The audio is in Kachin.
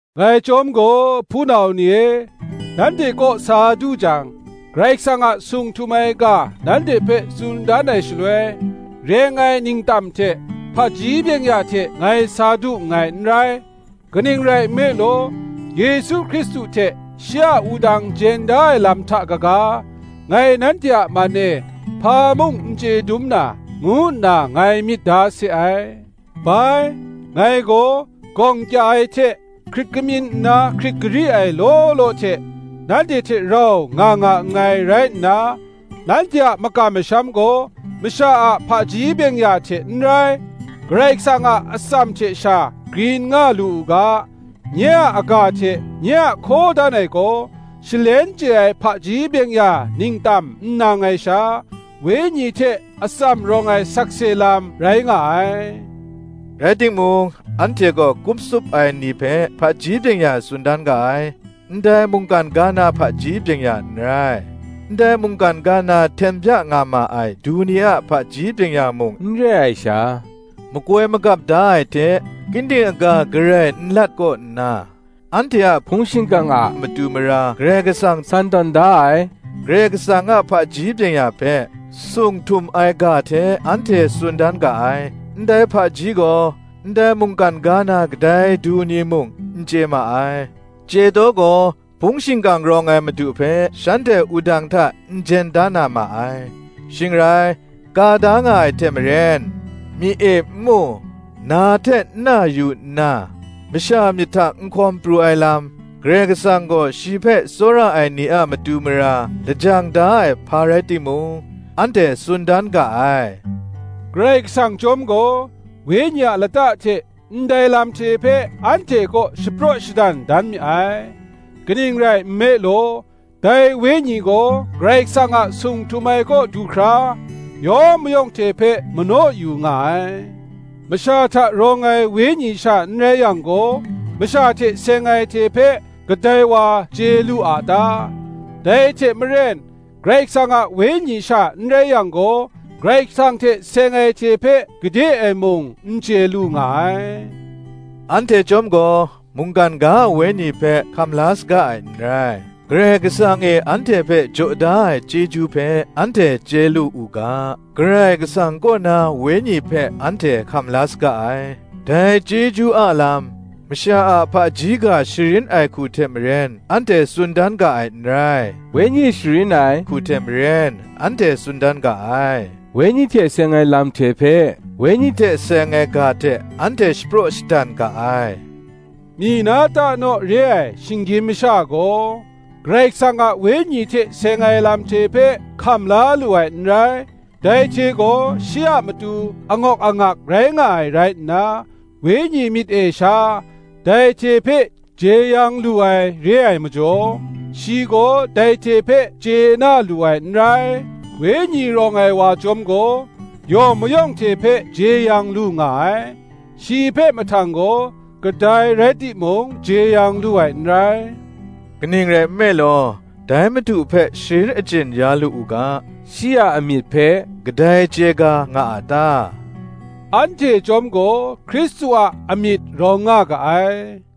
Ngai chyawm gaw, hpunau ni e, nanhte kaw sa du jang, Karai Kasang a sung htum ai ga nanhte hpe tsun dan ai shaloi, reng ai ningtam hte hpaji byeng-ya hte ngai sa du nngai n rai. Kaning rai nme law, Yesu Hkristu hte shi a wudang jen da ai lam hta kaga, ngai nanhte a man e hpa mung n chye dum na, ngu nna ngai myit da se ai. Bai, ngai gaw, gawng kya ai hte, hkrit kamyin nna hkrit gari ai law law hte, nanhte hte rau nga nga nngai rai nna, nanhte a makam masham gaw, masha a hpaji byeng-ya hte n rai, Karai Kasang a atsam hte sha grin nga lu u ga, nye a aga hte nye a hkaw dan ai gaw, shalen chye ai hpaji byeng-ya ningtam n nang ai sha, Wenyi hte atsam rawng ai sakse lam rai nga ai. Rai timung, anhte gaw kup tsup ai ni hpe hpaji byeng-ya tsun dan ga ai: ndai mungkan ga na hpaji byeng-ya n rai; ndai mungkan ga na hten bya nga ma ai du ni a hpaji byeng-ya mung n re ai sha, makoi magap da ai hte, ginding aga garai n lat kaw nna, anhte a hpung shingkang a matu mara Karai Kasang san tawn da ai, Karai Kasang a hpaji byeng-ya hpe, sung htum ai ga hte anhte tsun dan ga ai. Ndai hpaji gaw, ndai mungkan ga na kadai du ni mung, n chye ma ai; chye taw gaw, hpung shingkang rawng ai Madu hpe shanhte wudang hta n jen da na ma ai. Shing rai, ka da nga ai hte maren, “Myi e n mu, na hte n na yu nna, Masha myit hta n hkawn pru ai lam, Karai Kasang gaw shi hpe tsawra ai ni a matu mara lajang da ai hpa rai timung,” anhte tsun dan ga ai. Karai Kasang chyawm gaw, Wenyi a lata hte ndai lam hte hpe anhte kaw shapraw shadan dan mi ai: kaning rai nme law, dai Wenyi gaw Karai Kasang a sung htum ai kaw du hkra, yawng mayawng hte hpe manaw yu nga ai. Masha hta rawng ai wenyi sha n rai yang gaw, masha hte seng ai hte hpe kadai wa chye lu a ta? Dai hte maren, Karai Kasang a Wenyi sha n rai yang gaw, Karai Kasang hte seng ai hte hpe gade ai mung n chye lu nga ai. Anhte chyawm gaw mungkan ga a wenyi hpe hkam la saga ai n rai; Karai Kasang e anhte hpe jaw da ai chyeju hpe anhte chye lu u ga, Karai Kasang kaw na Wenyi hpe anhte hkam la saga ai: dai chyeju a lam, masha a hpaji ga sharin ai hku hte maren anhte tsun dan ga ai n rai; Wenyi sharin ai hku hte maren anhte tsun dan ga ai: Wenyi hte seng ai lam hte hpe, Wenyi hte seng ai ga hte anhte shapraw shadan ga ai. Myi na ta naw re ai shinggyim masha gaw, Karai Kasang a Wenyi hte seng ai lam hte hpe hkam la lu ai n rai, dai hte gaw shi a matu angawk angak rai nga ai rai nna, Wenyi myit e sha dai hte hpe jeyang lu ai re ai majaw, shi gaw dai hte hpe chye na lu ai n rai. Wenyi rawng ai wa chyawm gaw yawng mayawng hte hpe jeyang lu nga ai; shi hpe mahtang gaw kadai rai timung jeyang ya lu ai n rai. Kaning rai nme law, dai Madu hpe sharin achyin ya lu u ga, shi a amyit hpe kadai chye ga nga a ta? Anhte chyawm gaw Hkristu a amyit rawng nga ga ai.